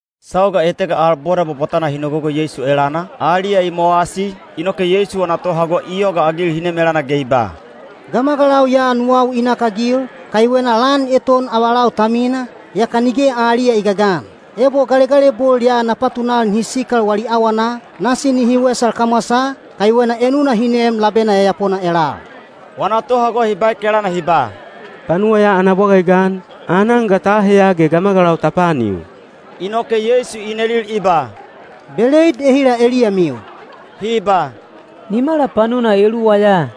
Sauga etega al boda bwabwatana hi nogogo Yeisu elana, aliya i mowasi, inoke Yeisu wana tohago i yogaagil hi nem elana ge i ba, “Gamagalau ya nuwau i nakagil, kaiwena lan eton avalau ta mina, yaka nige aliya i gagan. Ebo galegalebol ya na patunal nihi sikal wali awana, nasi nihi wesal kamwasaa, kaiwena enuna hi neem labena yayapona elal.” Wana tohago hi baek elana hi ba, “Panuwa ya ana bwaga i gan, aanan ga ta aheya ge gamagalau ta paanil?” Inoke Yeisu i nelil i ba, “Beleid ehila eliyamiu?” Hi ba, “Nimala panuna eluwa ya.”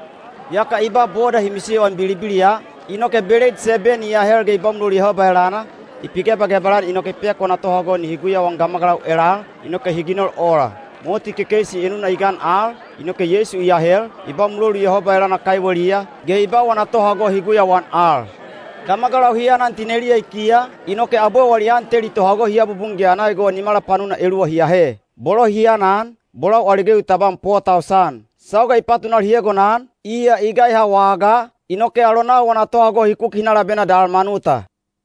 Yaka i ba boda hi misiyoan bilibiliya, inoke beleid seben i ahel ge i ba mulolu Yehoba elana, i pigebagebal-an inoke i pek wana tohago nihi guyauan gamagalau elal, inoke hi ginol ola. Moti kekeisi enuna i gan al, inoke Yeisu i ahel, i ba mulolu Yehoba elana kaiweliya, ge i ba wana tohago hi guyauan al. Gamagalau hi anan tineliya i kiya, inoke abwe wali an teli tohago hi abubun ge ana egowa nimala panuna eluwa hi ahe. Bolo hi anan, bolau ali gewi tabam po tausan. Sauga i patunal hi egonan, iya i gaiha wagaa, inoke alonau wana tohago hi kuki hi na labena Dalmanuta.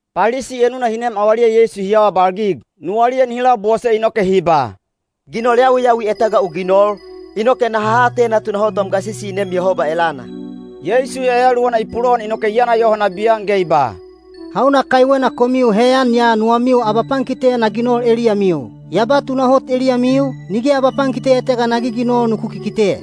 Palisi enuna hi nem avaliya Yeisu hi awabalgig. Nuwaliya nihi labose inoke hi ba, “Ginol yawiyawi etega u ginol, inoke naha atena tunahot wam gasisi i neem Yehoba elana.” Yeisu yayaluwana i pulowan inoke i yana yoho nabiyan ge i ba, “Hauna kaiwena komiu heyan ya nuwamiu abapankite na ginol eliyamiu? Ya ba tunahot eliyamiu, nige abapankite etega na giginol nuku kikite.”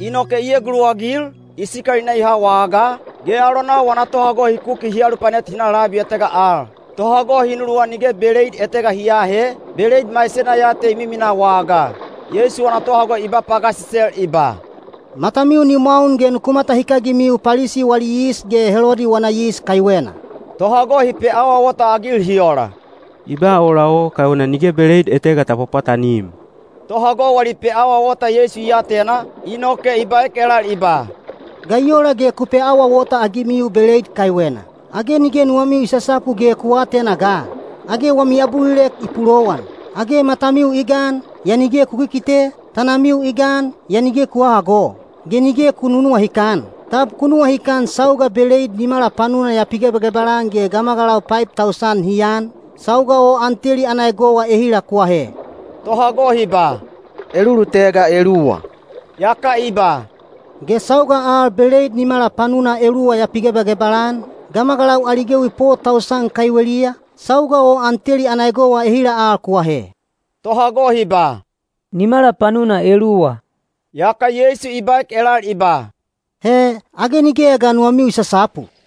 Inoke i eguluwagil, i sikal i na i ha wagaa, ge alonau wana tohago hi kuki hi alupanet hi na labi etega al. Tohago hi nuluwan nige beleid etega hi aahe, beleid maisena ya te i miminaa wagaa. Yeisu wana tohago i ba pagasisel i ba, “Matamiu ni mwaun ge nuku matahikagimiu Palisi wali yis ge Helodi wana yis kaiwena.” Tohago hi peawaawota-agil hi ola, “I ba ola o kaiwena nige beleid etega ta pwapwatanim.” Tohago wali peawaawota Yeisu i atena, inoke i baek elal i ba, “Ga i ola ge ku peawaawota-agimiu beleid kaiwena? Age nige nuwamiu i sasapu ge ku aatena ga? Age wami abulilek i pulowan! Age matamiu i gan, yaa nige ku kikite, tanamiu i gan, yaa nige ku hahago! Ge nige ku nunuwahikan? Tab ku nuwahikan sauga beleid nimala panuna ya pigebagebal-an ge gamagalau paib tausan hi an, sauga o an teli ana egowa ehila ku ahe?” Tohago hi ba, “Elulutega eluwa.” Yaka i ba, “Ge sauga al beleid nimala panuna eluwa ya pigebagebal-an, gamagalau ali gewi po tausan kaiweliya, sauga o an teli ana egowa ehila al ku ahe?” Tohago hi ba, “Nimala panuna eluwa.” Yaka Yeisu i baek elal i ba, “He, age nigeya ga nuwamiu i sasapu?”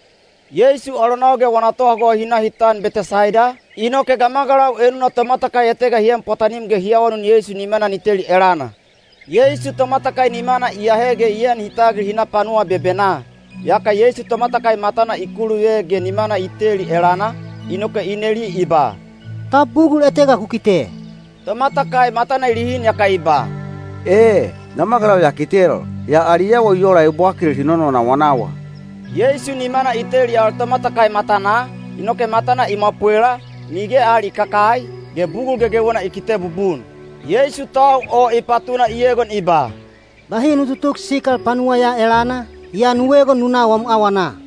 Yeisu alonau ge wana tohago hi na hi tan Betesaida, inoke gamagalau enuna tomatakai etega hi en pwatanim ge hi awanun Yeisu nimana ni teli elana. Yeisu tomatakai nimana i ahe ge i en hi tagil hi na panuwa bebenaa. Yaka Yeisu tomatakai matana i kuluve ge nimana i teli elana, inoke i neli i ba, “Tab bugul etega u kite?” Tomatakai matana i lihin yaka i ba, “E, gamagalau ya kitel, yaa ali awa i ola ebwakil hi nononawanawa.” Yeisu nimana i teli al tomatakai matanaa, inoke matana i mwapwela, nige al i kakai, ge bugul gegewena i kite bubun. Yeisu tau o i patuna i egon i ba, “Bahi nu tutuk sikal panuwa ya elana, yaa nu egon nu na wam awana.”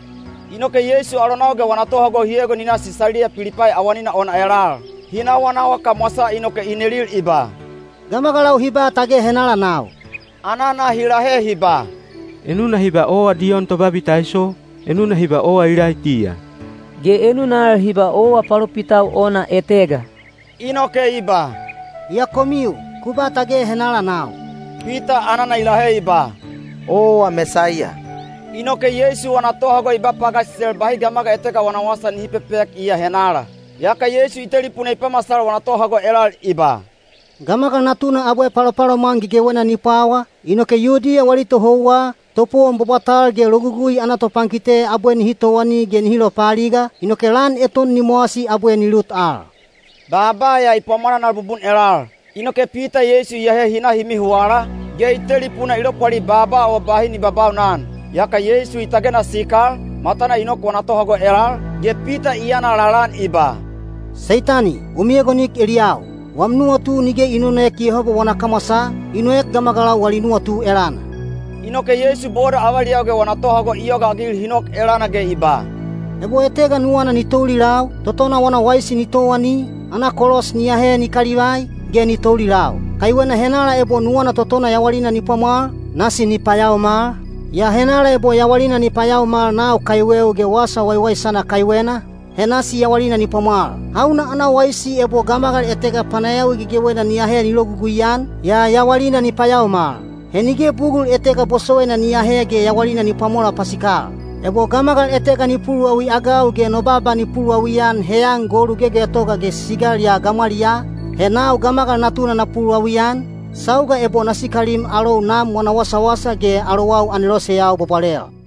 Inoke Yeisu alonau ge wana tohago hi egon hi na Sisaliya Pilipai awanina ona elal. Hi nawanawa kamwasaa inoke i nelil i ba, “Gamagalau hi ba tage henala nau?” Anana hi lahe hi ba, “Enuna hi ba owa Diyon Tobabitaiso, enuna hi ba owa Ilaitiya, ge enuna al hi ba owa palopitau ona etega.” Inoke i ba, “Yaa komiu, ku ba tage henala nau?” Pita anana i lahe i ba, “Owa Mesaiya.” Inoke Yeisu wana tohago i ba pagasisel bahi gamagal etega wana wasa nihi pepek iya henala. Yaka Yeisu i telipuna i pamasal wana tohago elal i ba, “Gamagal Natuna abwe palopalomwan gegewena ni pwawa, inoke Yudiya wali tohouwa, topowon bwabwatal ge Logugui ana topankite abwe nihi towani ge nihi lopaaliga, inoke lan eton ni mowasi abwe ni lut al.” Baaba ya i pwamwananal bubun elal. Inoke Pita Yeisu i ahe hi na hi mihuwala, ge i telipuna i lopwali baaba o bahi ni babaunan. Yaka Yeisu i tagena sikal, matana i nok wana tohago elal, ge Pita i yana lalaan i ba, “Seitani, u miegon eliyau! Wam nuwatu nige i nonoek Yehoba wana kamwasaa, i noek gamagalau wali nuwatu elana.” Inoke Yeisu boda avaliyau ge wana tohago i yogaagil hi nok elana ge i ba, “Ebo etega nuwana ni toulilau, totona wana waisi ni towani, ana kolos ni ahe ni kalivai, ge ni toulilau. Kaiwena henala ebo nuwana totona yawalina ni pwamwal, nasi ni payaomal, yaa henala ebo yawalina ni payaomal nau kaiweu ge wasa waiwaisana kaiwena, he nasi yawalina ni pwamwal. Hauna ana waisi ebo gamagal etega panayawi gegewena ni ahe ni logugui-an, yaa yawalina ni payaomal? He nige bugul etega bosowaina ni ahe ge yawalina ni pwamola pasikal. Ebo gamagal etega ni puluwawi-agau ge no baaba ni puluwawi-an heyan golu gegetogal ge sisigal ya gamwaliyaa, he nau Gamagal Natuna na puluwawi-an, sauga ebo na sikalim alou Nam wana wasawasa ge alowau aneloseyau bwabwalel.”